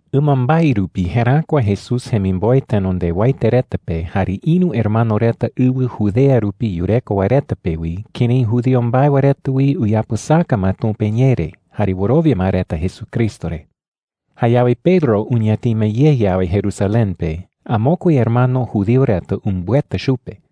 Ɨmambae rupi jeräkua Jesús jemimboe tenondewaete reta pe jare ïru hermano reta ɨwɨ Judea rupi yureko wae reta pe wi kërái judío mbae wae reta wi uyapɨsaka ma Tumpa iñee re jare wɨrowia ma reta Jesucristo re. Jayawe Pedro uñatima ye yawe Jerusalén pe, amokue hermano judío reta umbɨeta chupe.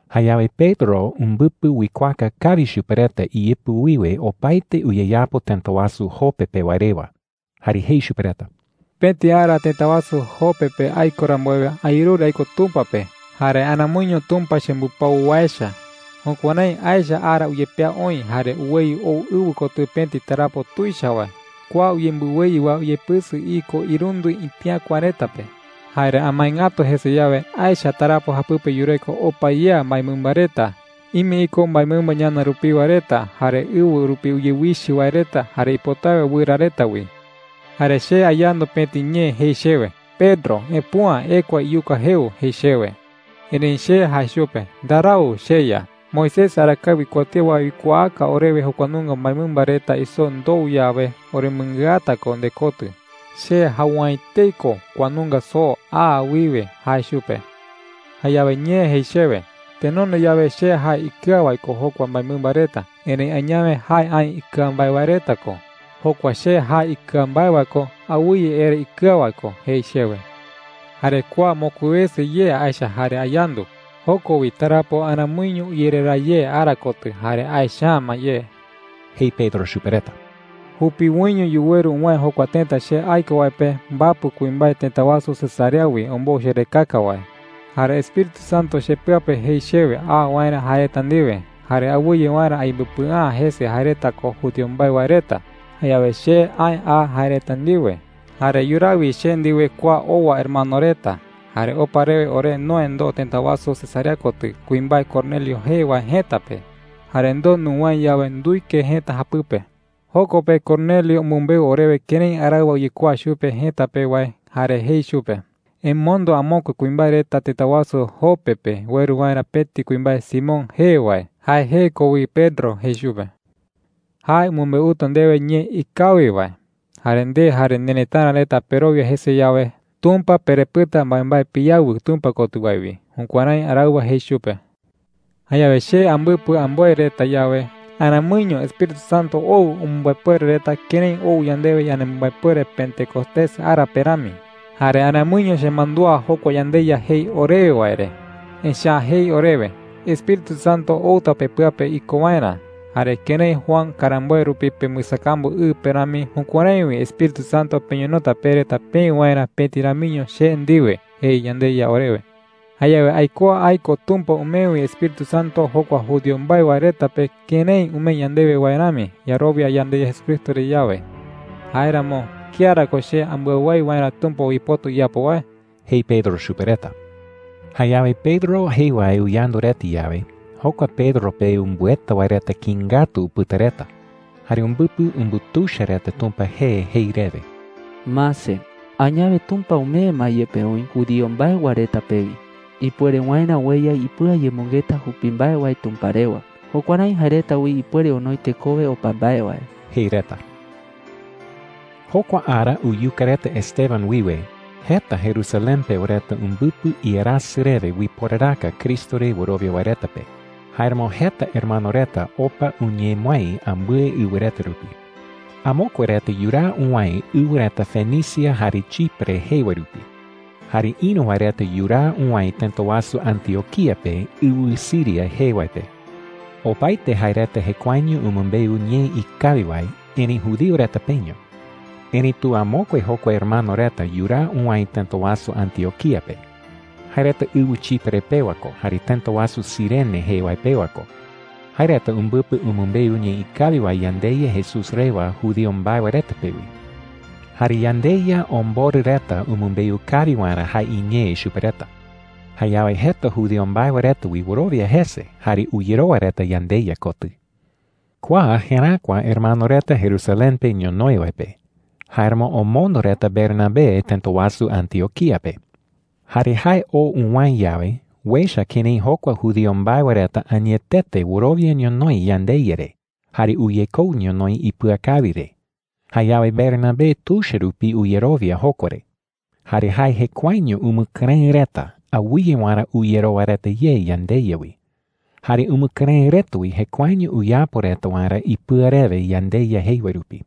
Jayawe Pedro umbɨpɨ uikuaaka kawi chupe reta iyɨpɨ wiwe opaete uyeyapo tëta wasu Jope pe wae rewa. Jae jei chupe reta: “Pëti ara tëta wasu Jope pe aiko rambuewe, ayerure aiko Tumpa pe. Jare aramoiño Tumpa chembɨpau wae echa,” jei. “Jukuärái aecha ara uyepea oï jare uweyɨ ou ɨwɨ kotɨ pëti tarapo tuicha wae. Kua uyembɨweyɨ wae uyepɨsɨ iko irundɨ itiäkua reta pe,” jei chupe reta. “Jare amae ngatu jese yawe, aecha tarapo japɨpe yureko opa yea mbaemɨmba reta. Ime iko mbaemɨmba ñana rupiwa reta, jare ɨwɨ rupi uyewichɨ wae reta, jare ipotawe wɨra reta wi,” jei. “Jare che ayandu pëti ñee jei chewe: ‘Pedro, epüa ekua iyuka jeu,’ jei chewe. Erëi che jae chupe: ‘Ndarau, cheYa. Moisés arakae uikuatía wae uikuaaka orewe jokua nunga mbaemɨmba reta isoo ndou yawe, oremɨngɨata ko ndekotɨ. Che jau’ä etei ko kua nunga soo aa wiwe,’ jae chupe. “Jayawe ñee jei chewe: ‘Tenonde yawe che jae ikɨa wae ko jokua mbaemɨmba reta. Erëi añawe jae aï ikɨa mbae wae reta ko. Jokua che jae ikɨa mbae wae ko, awɨye ere ikɨa wae ko,’ jei chewe. “Jare kua mokui wese ye aecha jare ayandu. Joko wi tarapo aramoiño uyereraa ye ara kotɨ jare aecha’ä ma ye,” jei Pedro chupe reta. “Jupiwoiño yuweru uwäe jokua tëta che aiko wae pe mbapɨ kuimbae tëta wasu Cesarea wi ombou cherekaka wae,” jei. “Jare Espíritu Santo chepɨa pe jei chewe a waerä jae reta ndiwe, jare awɨye waerä ayembɨpɨa’ä jese jae reta ko judío mbae wae reta. Jayawe che aë a jae reta ndiwe. Jare yuraa wi che ndiwe kua owa hermano reta. Jare opa rewe ore noë ndoo tëta wasu Cesarea kotɨ kuimbae Cornelio jee wae jëta pe. Jare ndoo nuwäe yawe, nduike jëta japɨpe,” jei chupe reta. “Joko pe Cornelio umɨmbeu orewe kërái araɨwa uyekuaa chupe jëta pe wae jare jei chupe: ‘Emondo amokue kuimbae reta tëta wasu Jope pe ueru waerä pëti kuimbae Simón jee wae. Jae jee ko wi Pedro,’ jei chupe. ‘Jae umɨmbeuta ndewe ñee ikawi wae. Jare nde jare nerëtara reta perowia jese yawe, Tumpa perepɨta mbaembae piyawɨ Tumpa kotɨ wae wi.’ Jukuärái araɨwa jei chupe,” jei. “Jayawe che ambɨpɨ amboe reta yawe, aramoiño Espíritu Santo ou umɨmbaepuere reta kërái ou yandewe yanemɨmbaepuere Pentecostés ara pe rami,” jei chupe reta. “Jare aramoiño chemandúa jokua yandeYa jei orewe wae re, echa’ä jei orewe: ‘Espíritu Santo outa pepɨa pe iko waerä. Jare kërái Juan karamboe rupi pembɨsakambu ɨ pe rami, jukuärái wi Espíritu Santo peñonota pe reta peï waerä pëti ramiño che ndiwe,’ jei yandeYa orewe,” jei. “Jayawe aikuaa aiko Tumpa umee wi Espíritu Santo jokua judío mbae wae reta pe kërái umee yandewe wae rami yarowia yandeYa Jesucristo re yawe. Jáeramo, ¿kía ra ko che ambɨawái waerä Tumpa uipota uyapo wae?” jei Pedro chupe reta. Jayawe Pedro jei wae uyandu reta yawe, jokua Pedro pe umbɨeta wae reta kïi ngatu upɨta reta. Jare umbɨpɨ umbutuicha reta Tumpa jee jei rewe: “Mase, añawe Tumpa umee ma yepe oï judío mbae wae reta pe wi ipuere waerä ueya ipɨayemɨngeta jupi mbae wae Tumpa rewa. Jukuärái jae reta wi ipuere onoi tekowe opa mbae wae,” jei reta. Jokua ara uyuka reta Esteban wiwe, jeta Jerusalén pewa reta umbɨpɨ iarasɨ rewe uiporaraka Cristo re wɨrowia wae reta pe. Jáeramo jeta hermano reta opa uñemɨái ambɨe ɨwɨ reta rupi. Amokue reta yuraa uwäe ɨwɨ reta Fenicia jare Chipre jee wae rupi. Jare ïru wae reta yuraa uwäe tëta wasu Antioquía pe, ɨwɨ Siria jee wae pe. Opaete jae reta jekuaeño umɨmbeu ñee ikawi wae, erëi judío reta peño. Erëitu amokue jokua hermano reta yuraa uwäe tëta wasu Antioquía pe. Jae reta ɨwɨ Chipre pewa ko jare tëta wasu Cirene jee wae pewa ko. Jae reta umbɨpɨ umɨmbeu ñee ikawi wae yandeYa Jesús rewa judío mbae wae reta pe wi. Jare yandeYa omborɨ reta umɨmbeu kawi waerä jae iñee chupe reta. Jayawe jeta judío mbae wae reta wi wɨrowia jese jare uyerowa reta yandeYa kotɨ. Kua jeräkua hermano reta Jerusalén pe ñonoï wae pe. Jáeramo omondo reta Bernabé tëta wasu Antioquía pe. Jare jae oo uwäe yawe, uecha kërái jokua judío mbae wae reta añetete wɨrowia ñonoï yandeYa re jare uyekou ñonoï ipɨakawi re. Jayawe Bernabé tuicha rupi uyerowia jokua re. Jare jae jekuaeño umɨkɨrëɨ reta awɨye waerä uyerowa reta ye yandeYa wi. Jare umɨkɨrëɨ reta wi jekuaeño uyapo reta waerä ipɨa rewe yandeYa jei wae rupi.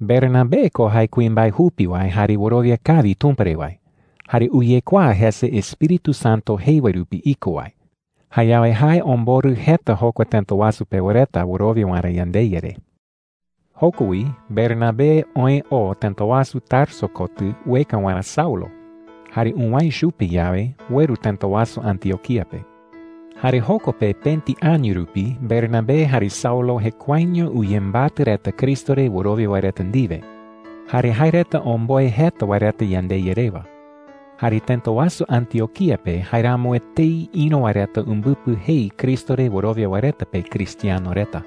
Bernabé ko jae kuimbae jupi wae, jare wɨrowia kawi Tumpa re wae, jare uyekuaa jese Espíritu Santo jei wae rupi iko wae. Jayawe jae omborɨ jeta jokua tëta wasu pewa reta wɨrowia waerä yandeYa re. Joko wi Bernabé oë oo tëta wasu Tarso kotɨ ueka waerä Saulo. Jare uwäe chupe yawe, ueru tëta wasu Antioquía pe. Jare joko pe pëti año rupi Bernabé jare Saulo jekuaeño uyembatɨ reta Cristo re wɨrowia wae reta ndiwe. Jare jae reta omboe jeta wae reta yandeYa rewa. Jare tëta wasu Antioquía pe jaeramo etei ïru wae reta umbɨpɨ jei Cristo re wɨrowia wae reta pe cristiano Kua tee uipota jei “Cristo ndiwe uñemɨïru wae.” reta.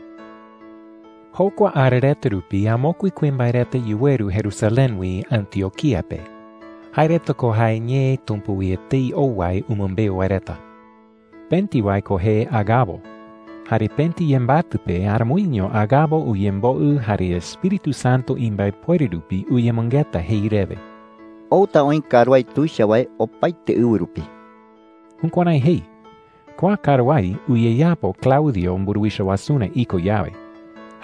Jokua ara reta rupi amokue kuimbae reta yuweru Jerusalén wi Antioquía pe. Jae reta ko jae ñee Tumpa wi etei ou wae umɨmbeu wae reta. Pëti wae ko jee Agabo. Jare pëti yembatɨ pe, aramoiño Agabo uyemboɨ jare Espíritu Santo imbaepuere rupi uyemɨngeta jei rewe: “Outa oï karuái tuicha wae opaete ɨwɨ rupi.” Jukuärái jei. Kua karuái uyeyapo Claudio mburuwicha wasurä iko yawe.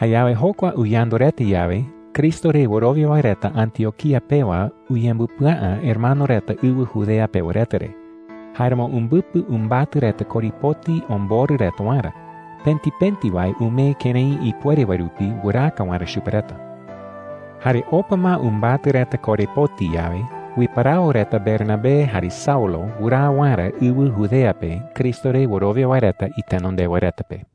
Jayawe jokua uyandu reta yawe, Cristo re wɨrowia wae reta Antioquía pewa uyembɨpɨa’ä hermano reta ɨwɨ Judea pewa reta re. Jáeramo umbɨpɨ umbatɨ reta korepoti omborɨ reta waerä. Pëti pëti wae umee kërái ipuere wae rupi wɨraaka waerä chupe reta. Jare opa ma umbatɨ reta korepoti yawe, uiparawo reta Bernabé jare Saulo wɨraa waerä ɨwɨ Judea pe Cristo re wɨrowia wae reta itenondewa reta pe.